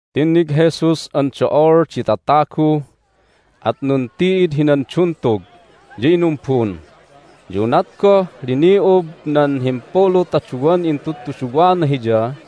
Tinnig Jesus an do'ol di tatagu, at nunti'id hinan duntug, ya inumbun. Ya unat goh lini'ub nan himpulu ta duwan intudtuduwana Hiya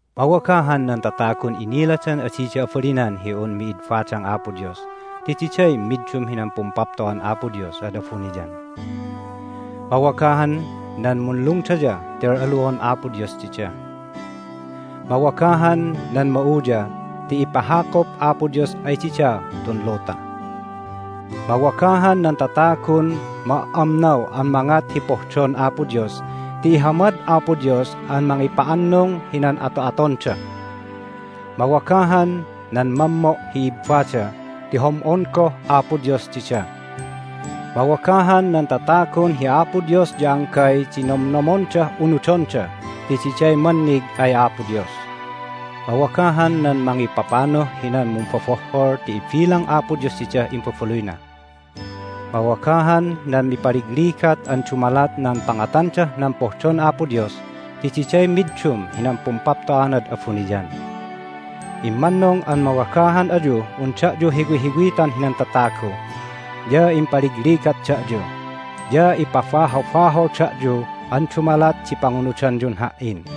"Mawagahan nan tatagun iniladan adida abalinan hi un mid badang Apo Dios ti diday middum hinan Pumpapto'an Apo Dios ad abuniyan! Mawagahan nan munlungdaya ti al'alu'on Apo Dios dida! Mawagahan nan ma'uya ti ipahakup Apo Dios ay dida tun luta! Mawagahan nan tatagun ma"amnaw an mangat hi pohdon Apo Dios ti ihamad Apo Dios an mangipa'annung hinan ato'atonda! Mawagahan nan mammo' hi ibbada ti hom'on goh Apo Dios dida! Mawagahan nan tatagun hi Apo Dios ya anggay di nomnomondah unudonda ti diday mannig ay Apo Dios! Mawagahan nan mangipapanuh hinan mumbobohhol ti ibilang Apo Dios didah imbabaluyna! Mawagahan nan mipaligligat an dumalat nan pangatandah nan pohdon Apo Dios ti diday middum hinan pumpapto'anad abuniyan! Immannung an mawagahan ayuh un da'yu hiwihiwitan hinan tatagu, ya impaligligat da'yu, ya ipabahobahol da'yu an dumalat di pangunudanyun Ha"in.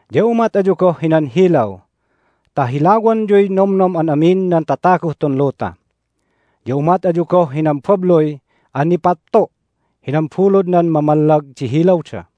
Ya umat ayu goh hinan hilaw ta hilawanyuy nomnom an amin nan tataguh tun luta. Ya umat ayu goh hinan babluy an nipattu' hinan buludnan mamallag di hilawda.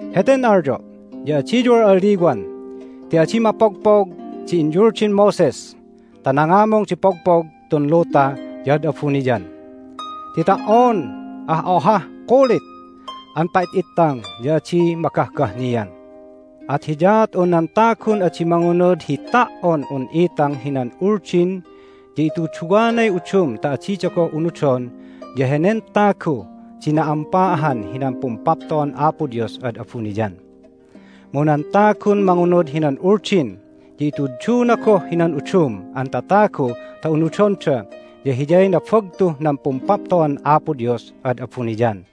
Heten alyo' ya adiyu al'aliwan ti adi mapogpog di inyuldin Moses ta nangamung di pogpog tun luta ya ad abuniyan, ti ta"on ah ohah kulit an pa"it'ittang ya adi magahgahnian! At hiyaat un nan tagun adi mangunud hi ta"on un itang hinan Uldin ya ituduwanay udum ta adida goh unudon ya henen tagu di na'ampa ahan hinan Pumpapto'an Apo Dios ad abuniyan. Mu nan tagun mangunud hinan Uldin ya ituduna goh hinan udum an tatagu ta unudonda ya hiyay nabagtuh nan Pumpapto'an Apo Dios ad abuniyan.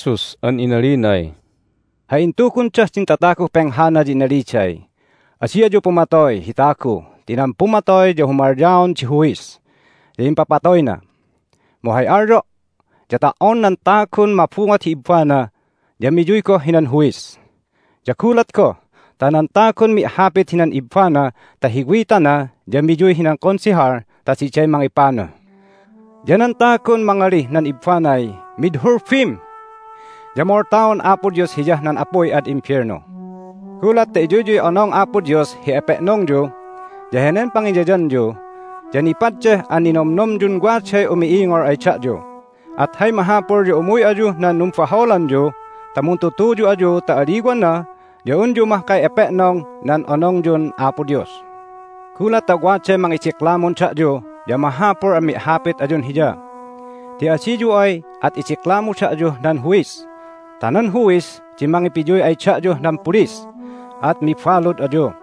Ya intuluy Jesus an inalinay, "Hay intugundah din tataguh penghana ya inaliday, Adi ayu pumatoy hi tagu ti nan pumatoy ya humalyaon di huis, ya impapatoyna. Mu hay alyo' ya ta"on nan tagun mabungot hi ibbana ya miyuy goh hinan huis. Ya gulat goh ta nan tagun mi'hapit hinan ibbana ta hiwitana ya miyuy hinan Konsehal ta diday mangipanuh. Ya nan tagun mangalih nan ibbanay, Mid hulbim! ya moltaon Apo Dios hiyah nan apuy ad imbelnu. Gulat ta iyuyyuy onong Apo Dios hi epe'nongyu, ya henen pangiyayanyu ya nipaddeh an ninomnomyun waday umi'ingol ay da'yu, at hay mahapul ya umuy ayuh nan numbaholanyu ta muntutuyu ayu ta aliwana ya unyu mahkay epe'nong nan onongyun Apo Dios. Gulat ta waday mangidiklamun da'yu ya mahapul an mi'hapit ayun hiya, ti adiyu ay at idiklamu da'yuh nan huis ta nan huwis di mangipiyuy ay da'yuh nan pulis, at mibalud ayu.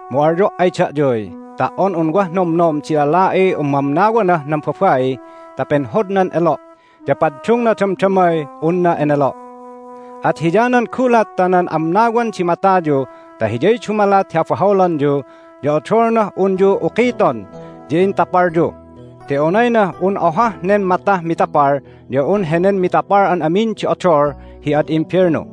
Mu alyo' ay da'yuy, Ta"on un wah nomnom di lala'iy umamnawanah nan babai ta penhodnan elo' ya paddungna damdamay unna enelo'. At hiyanan gulat ta nan amnawan di matayu ta hiyay dumalat hi abaholanyu ya odolnah unyu ukiton ya intapalyu, ti onaynah un ohah nen matah mitapal ya un henen mitapal an amin di odol hi ad imbelnu.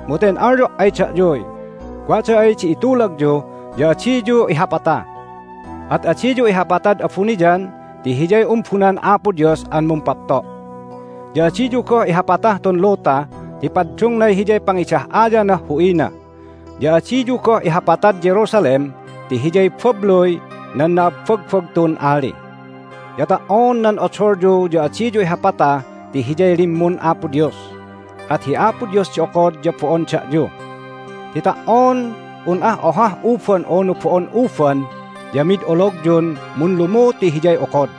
Mu ten alyo' ay da'yuy, Wada ay di itulagyu ya adiyu ihapata. At adiyu ihapatad abuniyan ti hiyay umbunan Apo Dios an mumpapto'. Ya adiyu goh ihapatah tun luta ti paddungnay hiyay pangidah'ayanah hu'ina. Ya adiyu goh ihapatad Jerusalem ti hiyay babluy nan na'abbagbagtun Ali. Ya ta"on nan odolyu ya adiyu ihapata ti hiyay limmun Apo Dios, at hi Apo Dios di okod ya bo'on da'yu. Ti ta"on un ah ohah uban unu bo'on uban ya mid ologyun munlumu ti Hiyay okod.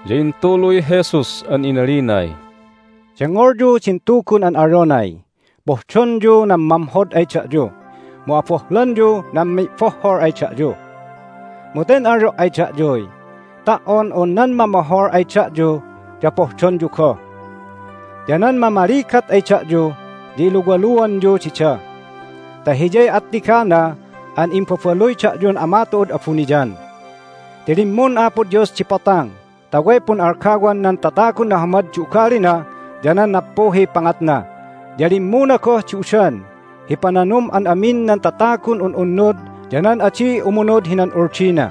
Ya intuluy Jesus an inalinay, "Dengngolyu din tugun an alyonay, Pohdonyu nan mamhod ay da'yu, mu abohlanyu nan mi'bohhol ay da'yu. Mu ten alyo' ay da'yuy, Ta"on un nan mamohol ay da'yu ya pohdonyu goh. Ya nan mamaligat ay da'yu ya iluwaluanyu dida ta hiyay attigana an imbabaluy da'yun Ama tu'ud abuniyan. Ti limmun Apo Dios di potang ta way pun'algawan nan tatagun nahamad di ugalina ya nan nappuhiy pangatna, ya limmuna goh di udan hi pananum an amin nan tatagun un'unnud ya nan adi umunud hinan Uldina.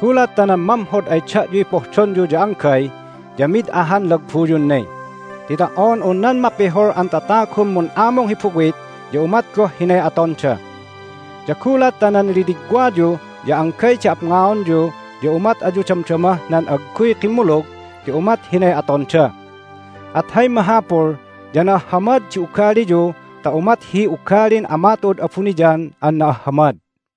Gulat ta nan mamhod ay da'yuy pohdonyu ya anggay ya mid ahan lagbuyun ne, ti ta"on un nan mapihul an tatagun mun'amung hi buwit ya umat goh hinay atonda. Ya gulat ta nan liligwayu ya anggay di apngaonyu ya umat ayu damdamah nan agguy kimmulug ti umat hinay atonda. At hay mahapul ya na'ahhamad di ugaliyu ta umat hi ugalin Ama tu'ud abuniyan an na'ahhamad."